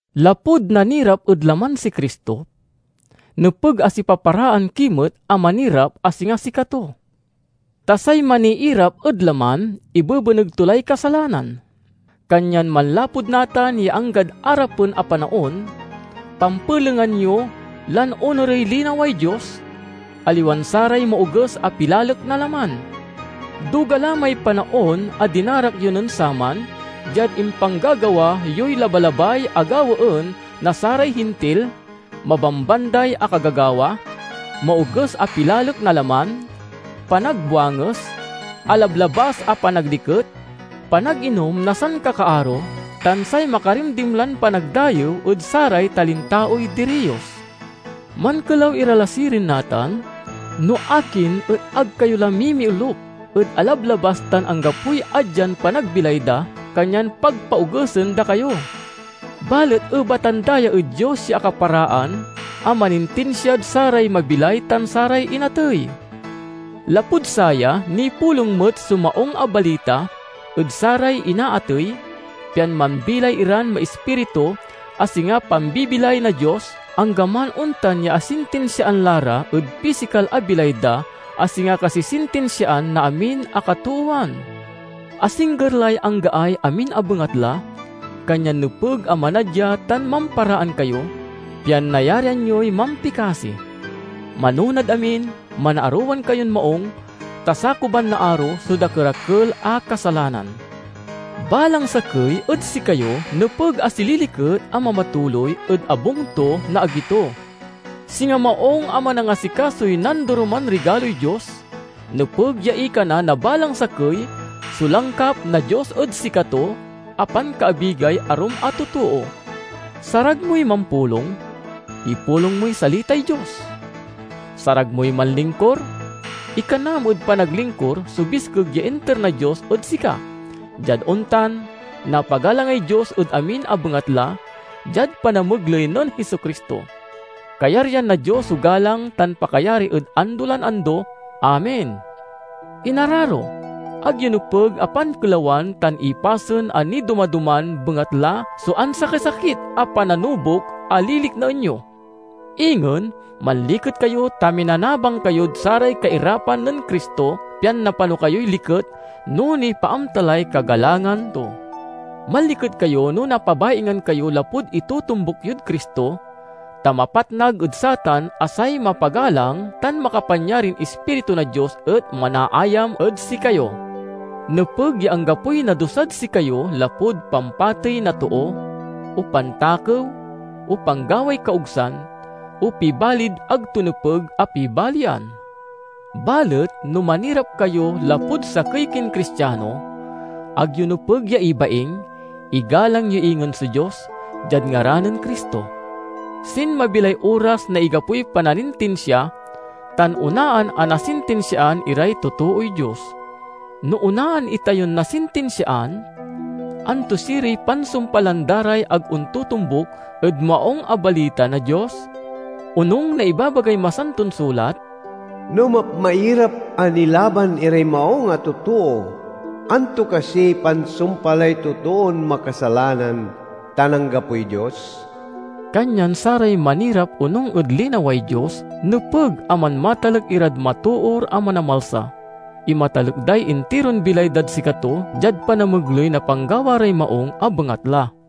Lapud nanirap ed laman si Cristo, nepeg a sipaparaan ki met a manirap a singa sikato. Ta say maniirap ed laman ibebeneg to lay kasalanan. Kanyan manlapud natan ya anggad arapen a panaon, pampelengan yo lan onurey linaway Dios, aliwan saray maoges a pilalek na laman. Duga la may panaon a dinarak yo nen saman diad impanggagawa yoy labalabay a gawaen na saray Hintil; mabambanday a kagagawa, maoges a pilalek na laman, panagbuanges, alablabas a panagliket, panaginom na sankakaaro, tan say makarimdimlan panagdayew ed saray talintaoy diriyos. Mankelaw ira la sirin natan no akin et ag kayo la mimiolup ed alablabas tan anggapoy adyan panagbilay da, kanyan pagpaogesen da kayo. Balet ebatan da ya ed Dios ya akaparaan a manintinsiad saray mabilay tan saray inatey. Lapud saya nipulong met so Maung a Balita ed saray inaatey, pian mambilay iran maispiritu a singa pambibilay na Dios, anggaman ontan ya asintinsiaan la ra ed pisikal a bilay da a singa kasisintinsiaan na amin a katoowan. Asingger lay anggaay amin a bengatla, kanyan nepeg a manadya tan mamparaan kayo, pian nayarian yoy mampikasi. Manonad amin, manaarowan kayon maung, ta sakuban na aro so dakerakel a kasalanan. Balang sakey ed sikayo nepeg a sililiket a mamatuloy ed abung to na agi to. Singa maung a manangasikasoy nandoroman rigaloy Dios, nepeg ya ikana na balang sakey so langkap na Dios ed sikato a pankaabigay arum a totoo. Sarag moy mampulong? Ipulong moy salitay Dios. Sarag moy manlingkur? Ikanam ed panaglingkur so biskeg ya inter na Dios ed sika; diad ontan, napagalangay Dios ed amin a bengatla, diad panamegley nen Jesu-Cristo. Kayaryan na Dios so galang tan pakayari ed ando lan ando! Amen. Inararo, ag yo nepeg a pankelawan tan ipasen a nidoma-doman bengatla so ansakisakit a pananubok a liliknaen yo. Ingen, manliket kayo ta minanabang kayod saray kairapan nen Cristo, pian napano kayoy liket no nipaamta lay kagalangan to. Manliket kayo no napabaingan kayo lapud itotombuk yod Cristo, ta mapatnag ed satan a say mapagalang tan makapanyarin Ispiritu na Dios et manaayam ed sikayo. Nepeg ya anggapoy nadusad sikayo lapud pampatey na too, o pantakew, o panggaway kaogsan, o pibalid ag to nepeg a pibalian. Balet no manirap kayo lapud sakey kin Cristiano, ag yo nepeg ya ibaing; igalang yo ingen so Dios diad ngaran nen Cristo. Sinmabi lay oras na igapoy pananintinsia, tan onaan a nasintinsiaan iray totooy Dios. No onaan itayon nasintinsiaan, anto siriy pansumpalan da ray ag ontotombuk ed Maung a Balita na Dios? Onung na ibabagay Masanton Sulat, "No mapmairap a nilaban iray maung a totoo, anto kasiy pansumpalay totoon makasalanan tan anggapoy Dios?" Kanyan saray manirap onung ed linaway Dios nepeg a manmatalek irad matoor a Manamalsa. Imatalek day intiron bilay dad sikato diad panamegley na panggawa ray maung a bengatla.